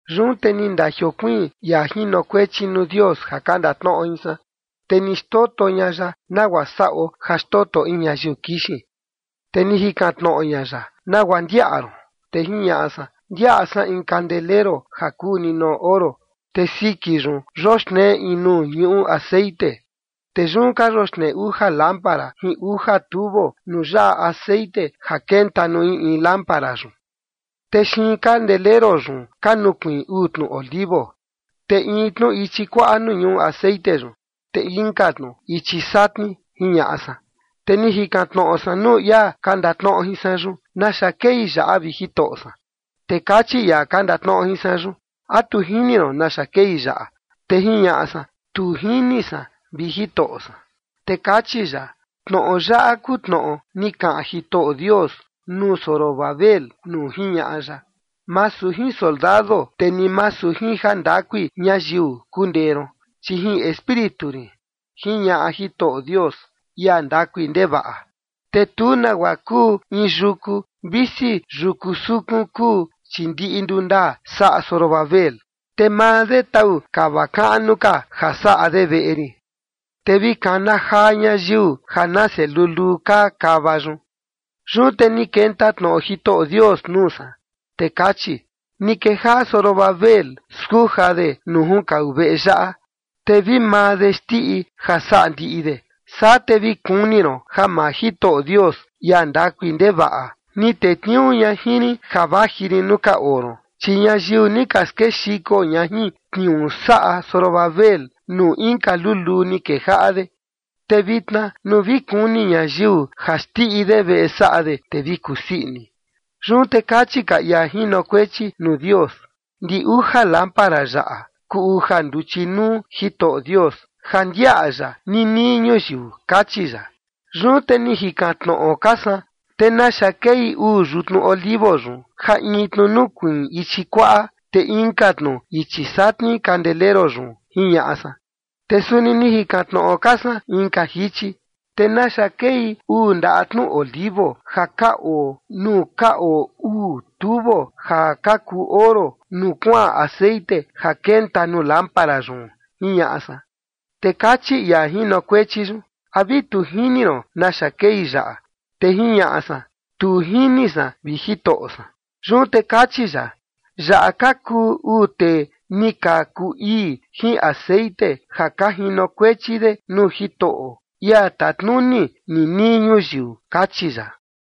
Yun te ni ndajiokuiin ia jinokuechi nuu Dios ja ka ndatnoꞌo jin san, te ni xtoto ña ya nagua saꞌo ja xtoto in ñayiu kixin. Te ni jikan tnoꞌo ña ya: “¿Nagua ndiaꞌa ron?” Te jiñaꞌa san: “Ndiaꞌa san in kandeleru ja kuu ninoꞌo oro, te siki yun yoxnee in nuu ñuꞌu texeꞌen. Te yun ka yoxnee uja lámpara jin uja tubo nuu yaꞌa texeꞌen ja kenta nuu in in lámpara yun. Te xiin kandeleru yun ka nukuiin uu tnu olivo, in tnu ichi kuaꞌa nuu ñuꞌu texeꞌen yun, te inka tnu ichi satni”, jiñaꞌa san. Te ni jikan tnoꞌo san nuu ia ka ndatnoꞌo jin san yun: “¿Naxa kei yaꞌa, vi Jitoꞌo san?” Te kachi ia ka ndatnoꞌo jin san: “¿A tu jini ron naxa kei yaꞌa?” Te jiñaꞌa san: “Tu jini san, vi Jitoꞌo san”. Te kachi ya: “Tnoꞌo yaꞌa kuu tnoꞌo ni kaꞌan Jitoꞌo Dios nuu Zorobabel nuu jiñaꞌa ya: Masu jin soldado, te ni masu jin jandakui ñayiu kundee ron, chi jin Espíritu rin, jiñaꞌa Jitoꞌo Dios, ia ndakui ndevaꞌa. Te tu nagua kuu in yuku, visi yuku sukun kuu, chi ndiꞌi ndundaa saꞌa Zorobabel, te maa de tau kava kaꞌnu ka ja saꞌa de veꞌe rin. Te vi kana jaa ñayiu ja nase luluu kaa kava yun.” Yun te ni kenta tnoꞌo Jitoꞌo Dios nuu san, te kachi: “Ni kejaꞌa Zorobabel skuja de nuu junkau veꞌe yaꞌa, te vi maa de xndiꞌi ja saꞌa ndiꞌi de, saa te vi kuni ron ja maa Jitoꞌo Dios, ia ndakui ndevaꞌa, ni tetniuu ña jin rin ja vaji rin nuu ka oo ron. Chi ñayiu ni ka skexiko ña jin tniuu saꞌa Zorobabel nuu inka luluu ni kejaꞌa de, te vitna nuu vi kuni ñayiu ja xndiꞌi de veꞌe saꞌa de, te vi kusii ini.” Yun te kachi ka ia jinokuechi nuu Dios: “Ndi uja lámpara yaꞌa kuu uja nduchi nuu Jitoꞌo Dios ja ndiaꞌa ya ninii ñuyiu”, kachi ya. Yun te ni jikan tnoꞌo ka san: “¿Te naxa kei uu yutnu olivo yun, ja in tnu nukuiin ichi kuaꞌa, te inka tnu ichi satni kandeleru yun?”, jiñaꞌa san. Te suni ni jikan tnoꞌo ka san inka jichi: “¿Te naxa kei uu ndaꞌa tnu olivo ja ka oo nuu ka oo uu tubo ja ka kuu oro nuu kuaꞌan texeꞌen ja kenta nuu lámpara yun?”, jiñaꞌa san. Te kachi ia jinokuechi yun: “¿A vi tu jini ron naxa kei yaꞌa?” Te jiñaꞌa san: “Tu jini san, vi Jitoꞌo san”. Yun te kachi ya: “Yaꞌa ka kuu uu tee ni ka kuu ii jin texeꞌen ja ka jinokuechi de nuu Jitoꞌo, ia tatnuni ninii ñuyiu”, kachi ya.